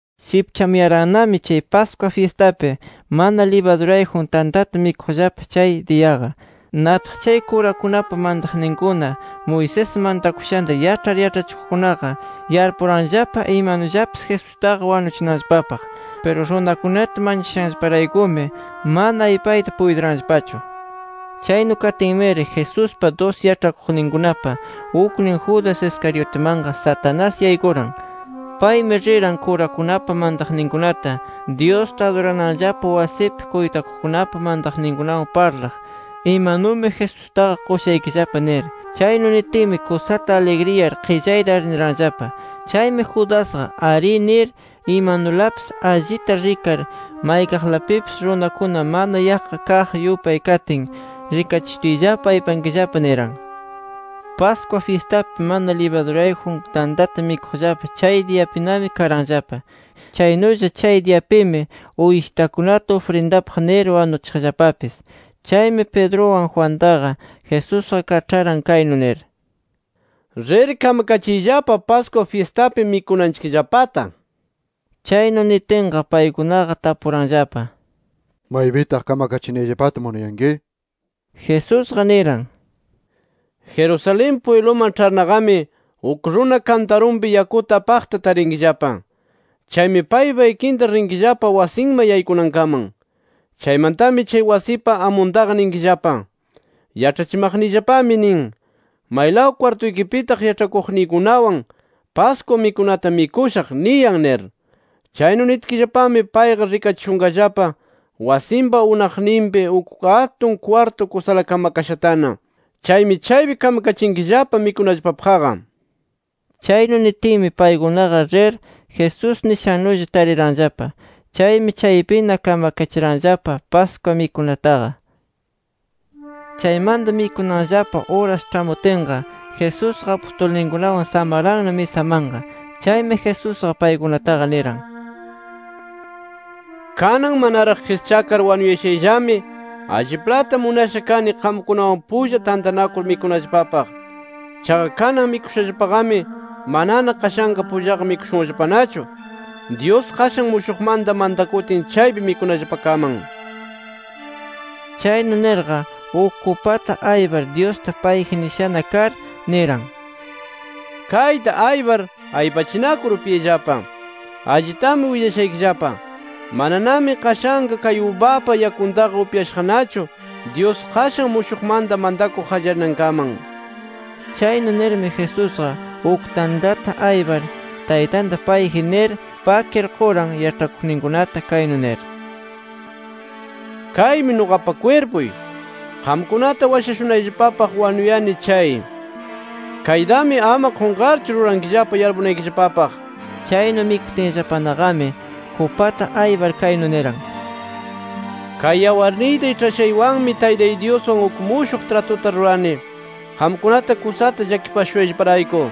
Shipchamuyarannami Pascua fyistapi mana libadurayjun tantata mikuqllapa chay diyaqa. Nataq chay kurakunapa mantakuqninkuna, Moisés mantakushanta yaĉhar yaĉhachikuqkunaqa, yarpuranllapa imanullapis Jesustaqa wanuchinanllapapaq. Piru runakunata manchashanllaparaykumi mana aypayta puytiranllapachu. Chaynu katinmiri, Jesuspa dusi yaĉhakuqninkunapa uknin Judas Iscariotimanqa Satanás yaykuran. Paymi riran kurakunapa mantakuqninkunata, Dyusta adurananllapa wasipi kuytakuqkunapa mantakuqninkunawan parlaq, “Imanumi Jesustaqa qushaykillapa” nir. Chaynu nitinmi, kusata aligriyar qillayta arniranllapa. Chaymi Judasqa “Arí” nir, imanulapis allita rikar maykaqlapipis runakuna mana yaqqa kaq yupay katin, “Rikachishutiyllapa aypankillapa” niran. Pascua fyistapi mana libadurayjun tantata mikuqllapa chay diyapinami karanllapa. Chaynulla chay diyapimi uyshitakunata ufrindapaq nir wanuchiqllapapis. Chaymi Pedruwan Juantaqa, Jesusqa kaĉharan kaynu nir: —Rir kamakachiyllapa Pascua fyistapi mikunanchikllapata. Chaynu nitinqa paykunaqa tapuranllapa: —¿Maypitaq kamakachinayllapata munayanki? nir. Jesusqa niran: —Jerusalén pwibluman ĉharnaqami, uk runa kantarunpi yakuta apaqta tarinkillapa. Chaymi paypa ikinta rinkillapa wasinman yaykunankaman. Chaymantami chay wasipa amuntaqa ninkillapa: ‘Yaĉhachimaqniyllapami nin: ¿Maylaw kwartuykipitaq yaĉhakuqniykunawan Pascua mikunata mikushaq? niyan’ nir. Chaynu nitkillapami payqa rikachishunqallapa wasinpa unaqninpi uk atun kwartu kusala kamakashatana. Chaymi chaypi kamkachinkillapa mikunallapapaqqa. Chaynu nitinmi paykunaqa rir, Jesús nishannulla tariranllapa. Chaymi chaypina kamakachiranllapa Pascua mikunataqa. Chaymanta mikunanllapa uras ĉhamutinqa, Jesusqa apustulninkunawan samaranna misamanqa. Chaymi Jesusqa paykunataqa niran: “Kanan manaraq qischakar wanuyashayllami, ¡alliplata munasha kani qamkunawan pulla tantanakur mikunallapapaq! Chaqa kanan mikushallapaqami manana qashanqa pullaqa mikushunllapanachu, Dyus qashan mushuqmanta mantakutin, chaypi mikunallapakaman”. Chaynu nirqa uk kupata aypar, Dyusta payji nishana kar niran: “Kayta aypar, aypachinakur upyayllapa. Allitami willashaykillapa, mananami qashanqa kay ubapa yakuntaqa upyashaqnachu, Dyus qashan mushuqmanta mantakuq qallarinankaman”. Chaynu nirmi, Jesusqa uk tantata aypar Taytanta payji nir, pakir quran yaĉhakuqninkunata kaynu nir: “Kaymi nuqapa kwirpuy. Qamkunata washashunayllapapaq wanuyani chay. Kaytami ama qunqarchu rurankillapa yarpumanaykillapapaq” nir. Chaynu mikutinllapanaqami, kupata aypar kaynu niran: “Kay yawarniyta iĉhashaywanmi Taytay Dyuswan uk mushuq tratuta rurani, qamkunata kusata llakipashushayllaparayku.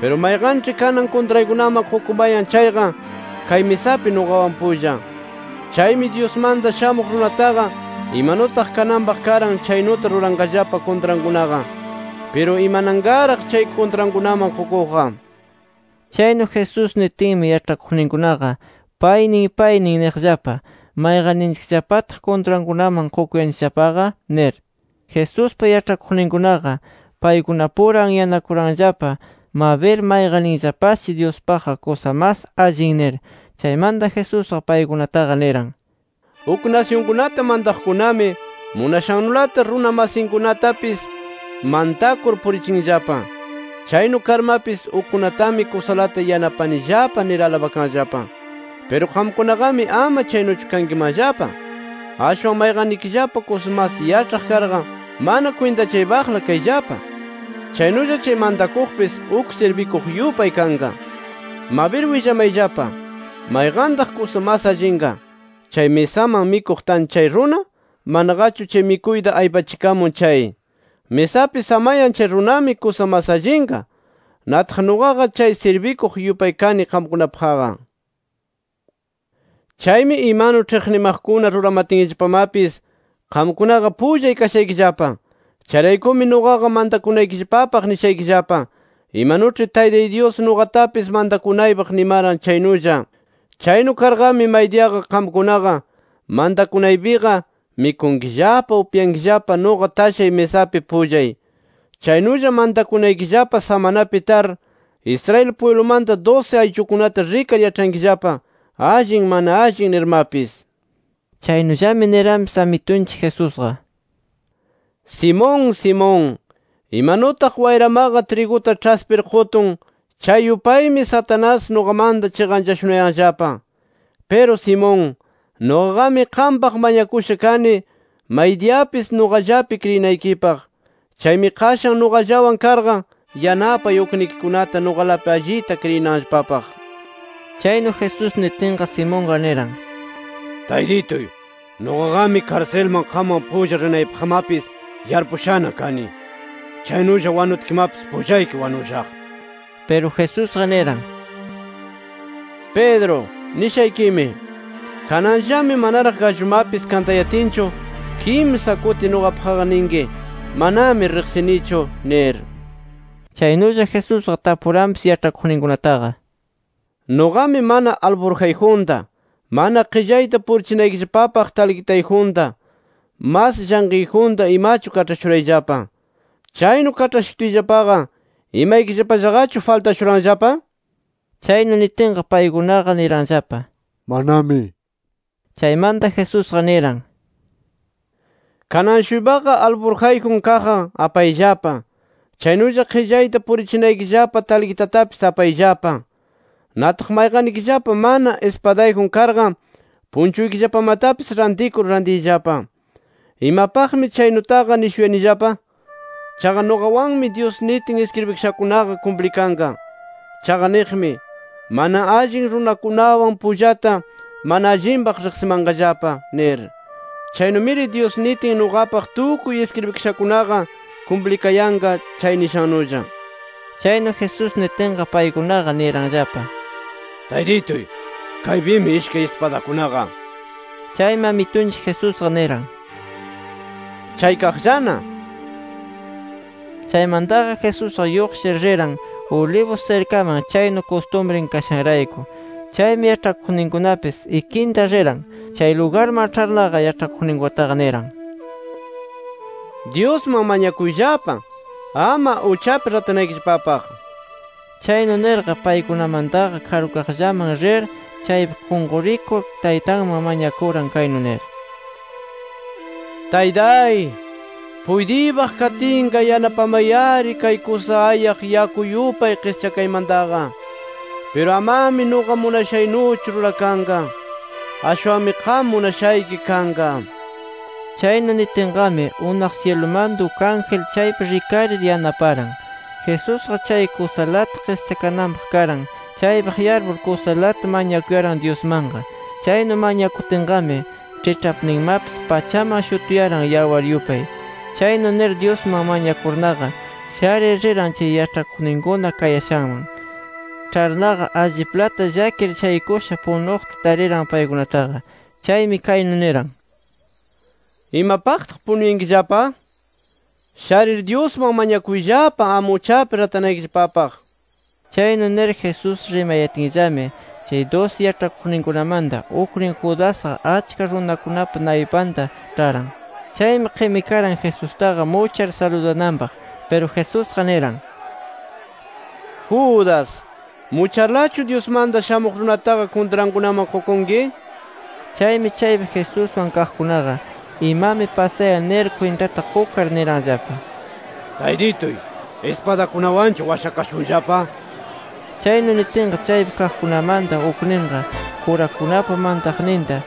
Piru, mayqanĉhi kanan kuntraykunaman qukumayan chayqa, kay misapi nuqawan pulla. Chaymi Dyusmanta Shamuq Runataqa, imanutaq kananpaq karan chaynuta ruranqallapa kuntrankunaqa. ¡Piru imananqaraq, chay kuntrankunaman qukuqqa!” Chaynu Jesús nitinmi yaĉhakuqninkunaqa, paynin paynin niqllapa: “¿Mayqanninchikllapataq kuntrankunaman qukuyanchikllapaqa?” nir. Jesuspa yaĉhakuqninkunaqa paykunapura anyanakuranllapa, mabir mayqanninllapashi Dyuspaqqa kusa mas allin nir. Chaymanta Jesusqa paykunataqa niran: “Uk nasyunkunata mantaqkunami munashannulata runa masinkunatapis mantakur purichinllapa. Chaynu karmapis, ‘Ukkunatami kusalata yanapanillapa’ nir alabakanllapa. Piru qamkunaqami ama chaynuchu kankimanllapa. Ashwan mayqannikillapa kusa mas yaĉhaq karqa, mana kwintachaypaqla kayllapa. Chaynulla chay mantakuqpis uk sirbikuq yupay kanqa. Mabir willamayllapa: ¿Mayqantaq kusa mas allinqa? ¿Chay misaman mikuq tan chay runa, manaqachu chay mikuyta aypachikamun chay? Misapi samayan chay runami kusa mas allinqa. Nataq nuqaqa chay sirbikuq yupay kani qamkunapaqqa. “Chaymi imanu ĉhiqnimaqkuna ruramatinllapamapis, qamkunaqa pullay kashaykillapa. Chayraykumi nuqaqa mantakunaykillapapaq nishaykillapa imanuĉhi Taytay Dyus nuqatapis mantakunaypaq nimaran, chaynulla. Chaynu karqami, maydiyaqa qamkunaqa mantakunaypiqa mikunkillapa, upyankillapa nuqa tashay misapi pullay. Chaynulla, mantakunaykillapa samanapi tar, Israel pwiblumanta dusi ayllukunata rikar yaĉhankillapa, allin mana allin nirmapis”. Chaynullami niranpis Amitunchik Jesusqa: —Simón, Simón, imanutaq wayramaqa triguta ĉhaspir qutun, chay yupaymi Satanás, nuqamanta chiqanchashunayanllapa. Piru Simón, nuqaqami qampaq mañakusha kani, maydiyapis nuqallapi kriyinaykipaq. Chaymi qashan nuqallawan karqa, yanapay uknikikunata nuqalapi allita kriyinanllapapaq. Chaynu Jesús nitinqa, Simonqa niran: —Taytituy, nuqaqami karsilman qamwan pulla rinaypaqmapis yarpushana kani. Chaynulla wanutkimapis pullayki wanushaq. Piru Jesusqa niran: —Pedro, nishaykimi: Kananllami manaraq gallumapis kantayatinchu, kimsa kuti nuqapaqqa ninki ‘Manami riqsinichu’ nir. Chaynulla Jesusqa tapuranpis yaĉhakuqninkunataqa: —Nuqami mana alfurjayjunta, mana qillayta purichinaykillapapaq talqitayjunta, mas llanqiyjunta imachu kaĉhashurayllapa. Chaynu kaĉhashutiyllapaqa, ¿imaykillapallaqachu faltashuranllapa? Chaynu nitinqa paykunaqa niranllapa: —¡Manami! Chaymanta Jesusqa niran: —Kanan-shuypaqa alfurjayjun kaqqa apayllapa. Chaynulla qillayta purichinaykillapa talqitatapis apayllapa. Nataq mayqannikillapa mana ispadayjun karqa, punchuykillapamatapis rantikur rantiyllapa. Imapaqmi chaynutaqa nishuyanillapa. Chaqa nuqawanmi Dyus nitin iskribikashankunaqa kumplikanqa. Chaqa niqmi: ‘Mana allin runakunawan pullata, mana allinpaq riqsimanqallapa’ nir. Chaynumiri Dyus nitin nuqapaq tukuy iskribikashakunaqa, kumplikayanqa chay nishannulla. Chaynu Jesús nitinqa, paykunaqa niranllapa: —Taytituy, kaypimi ishkay ispadakunaqa nir. Chaymi Amitunchik Jesusqa niran: —Chaykaqllana nir. Chaymantaqa Jesusqa lluqshir riran Olivos sirkaman, chaynu kustumrin kashanrayku. Chaymi yaĉhakuqninkunapis ikinta riran. Chay lugarman ĉharnaqa, yaĉhakuqninkunataqa niran: —Dyusman mañakuyllapa ama uchapi ratanaykillapapaq. Chaynu nirqa paykunamantaqa karukaqllaman rir, chaypi qunqurikur Taytanman mañakuran, kaynu nir: “Taytay, puytiypaq katinqa yanapamay-ari kay kusa ayaq yaku yupay qischakaymantaqa. Piru amami nuqa munashaynuchu rurakanqa. Ashwanmi qam munashayki kanqa” nir. Chaynu niyatinqami, unaq syilumanta uk ángel chaypi rikarir yanaparan. Jesusqa chay kusalata qischakananpaq karan, chaypaq yarpur kusalata mañakuyaran Dyusmanqa. Chaynu mañakutinqami, ĉhiĉhapninmapis pachaman shutuyaran yawar yupay. Chaynu nir, Dyusman mañakurnaqa sharir riran chay yaĉhakuqninkuna kayashanman. Ĉharnaqa alliplata llakir shaykusha punuqta tariran paykunataqa. Chaymi kaynu niran: —¿Imapaqtaq punuyankillapa? Sharir Dyusman mañakuyllapa, ama uchapi ratanaykillapapaq nir. Chaynu nir Jesús rimayatinllami, chay dusi yaĉhakuqninkunamanta uknin Judasqa, achka runakunapa naypanta ĉharan. Chaymi qimikaran Jesustaqa muchar saludananpaq. Piru Jesusqa niran: —Judas, ¿mucharlachu Dyusmanta Shamuq Runataqa kuntrankunaman qukunki? nir. Chaymi chaypi Jesuswan kaqkunaqa, imami pasayan nir kwintata qukar, niranllapa: —Taytituy, ¿ispadakunawanchu washakashunllapa? nir. Chaynu nitinqa, chaypi kaqkunamanta ukninqa, kurakunapa mantaqninta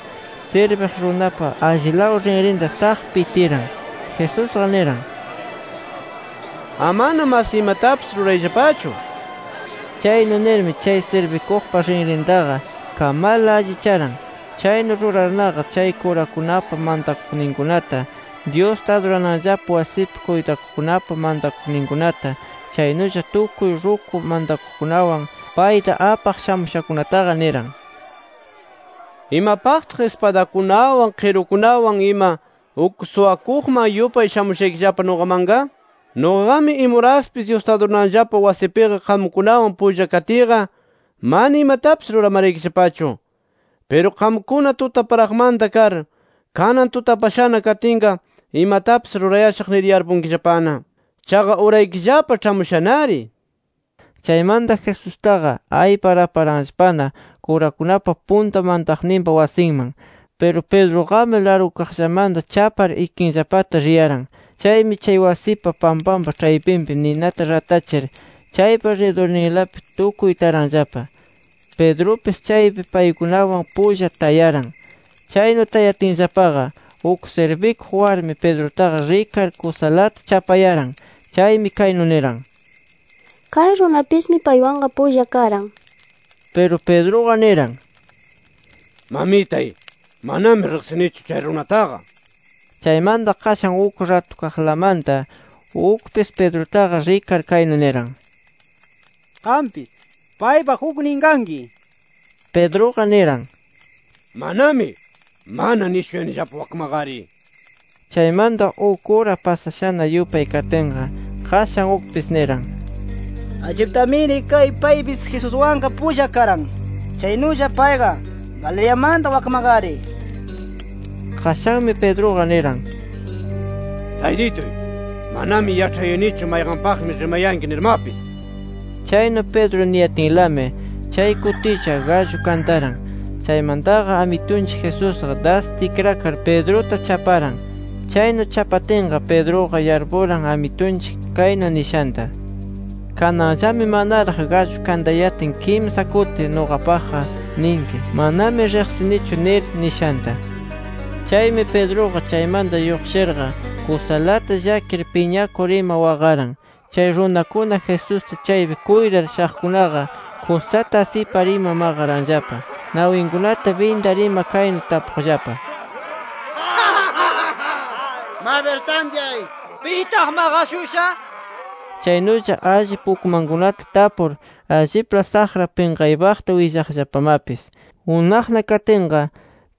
sirbiq runapa allilaw rinrinta ¡saq! pitiran. Jesusqa niran: —¡Amana mas imatapis rurayllapachu! nir. Chaynu nirmi chay sirbikuqpa rinrintaqa kamarla, allicharan. Chaynu rurarnaqa chay kurakunapa mantakuqninkunata, Dyusta adurananllapa wasipi kuytakuqkunapa mantakuqninkunata, chaynulla tukuy ruku mantakuqkunawan payta apaq shamushakunataqa, niran: —¿Imapaqtaq ispadakunawan, qirukunawan ima, uk suwakuqman yupay shamushaykillapa nuqamanqa? Nuqaqami imuraspis Dyusta adurananllapa wasipiqa qamkunawan pulla katiyqa, mana imatapis ruramaraykillapachu. Piru qamkuna tutaparaqmanta kar, kanan tutapashana katinqa, imatapis rurayashaq nir yarpunkillapana. Chaqa uraykillapa ĉhamushanari nir. Chaymanta Jesustaqa aypar aparanllapana kurakunapa punta mantaqninpa wasinman. Piru Pedruqami largukaqllamanta chapar, ikinllapata riyaran. Chaymi chay wasipa pampanpa ĉhaypinpi ninata ratachir chaypa ridurninlapi tukuy taranllapa. Pedrupis chaypi paykunawan pulla tayaran. Chaynu tayatinllapaqa, uk sirbikuq warmi Pedrutaqa rikar, kusalata chapayaran. Chaymi kaynu niran: —Kay runapismi paywanqa pulla karan nir. Piru Pedruqa niran: —Mamitay, manami riqsinichu chay runataqa nir. Chaymanta qashan uk ratukaqlamanta ukpis Pedrutaqa rikar, kaynu niran: —Qampis paypa uknin kanki nir. Pedruqa niran: —¡Manami! Mana nishuyanillapa wakmaqari. Chaymanta uk ura pasashana yupay katinqa, qashan ukpis niran: —Alliptamiri kay paypis Jesuswanqa pulla karan. Chaynulla payqa Galileamanta wakmaqari. Qashanmi Pedruqa niran: —¡Taytituy, manami yaĉhayanichu mayqanpaqmi rimayanki nirmapis! Chaynu Pedro niyatinlami chay kutilla, gallu kantaran. Chaymantaqa Amitunchik Jesusqa das tikrakar Pedruta chaparan. Chaynu chapatinqa, Pedruqa yarpuran, Amitunchik kaynu nishanta: “Kananllami manaraq gallu kantayatin kimsa kuti nuqapaqqa ninki: ‘Manami riqsinichu’ nir” nishanta. Chaymi Pedruqa chaymanta lluqshirqa kusalata llakir, piñakur ima waqaran. Chay runakuna Jesusta chaypi kuytar shaqkunaqa kusata asipar ima maqaranllapa. Nawinkunata bindar ima kaynu tapuqllapa: —Mabir tantyay ¿pitaq maqashusha? nir ima. Chaynulla, allip ukmankunata tapur allipla saqra pinqaypaqta willaqllapamapis. Unaqna katinqa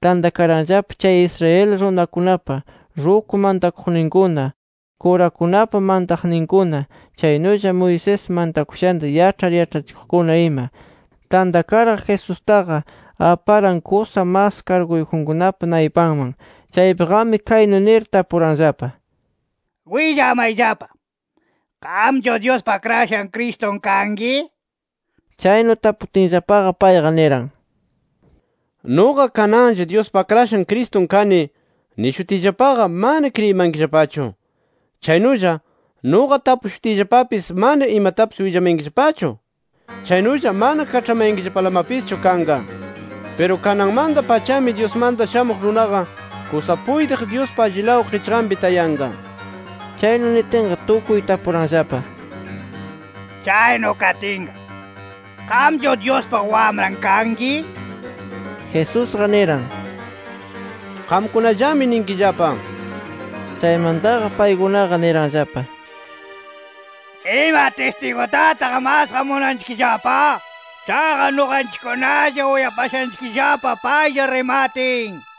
tantakaranllapa, chay Israel runakunapa ruku mantakuqninkuna, kurakunapa mantaqninkuna, chaynulla Moisés mantakushanta yaĉhar yaĉhachikuqkuna ima. Tantakarqa Jesustaqa aparan kusa mas karguyjunkunapa naypanman. Chaypiqami, kaynu nir tapuranllapa: —Willamayllapa: ¿Qamchu Dyuspa Akrashan Cristun kanki? nir. Chaynu taputinllapaqa, payqa niran: —Nuqa, kananlla ‘Dyuspa Akrashan Cristun kani’ nishutiyllapaqa, mana kriyimankillapachu. Chaynulla, nuqa tapushutiyllapapis mana imatapis willamayankillapachu [chaynulla mana kaĉhamayankillapalamapischu] kanqa. Piru kananmanta-pachami, Dyusmanta Shamuq Runaqa kusa puytiq Dyuspa allilaw qichqanpi tayanqa. Chaynu nitinqa tukuy tapuranllapa: —Chaynu katinqa, ¿qamchu Dyuspa Wamran kanki? nir. Jesusqa niran: —Qamkunallami ninkillapa. Chaymantaqa paykunaqa niranllapa: —¿Ima tistigutataq masqa munanchikllapa? Chaqa nuqanchikkunalla uyapashanchikllapa paylla rimatin nir.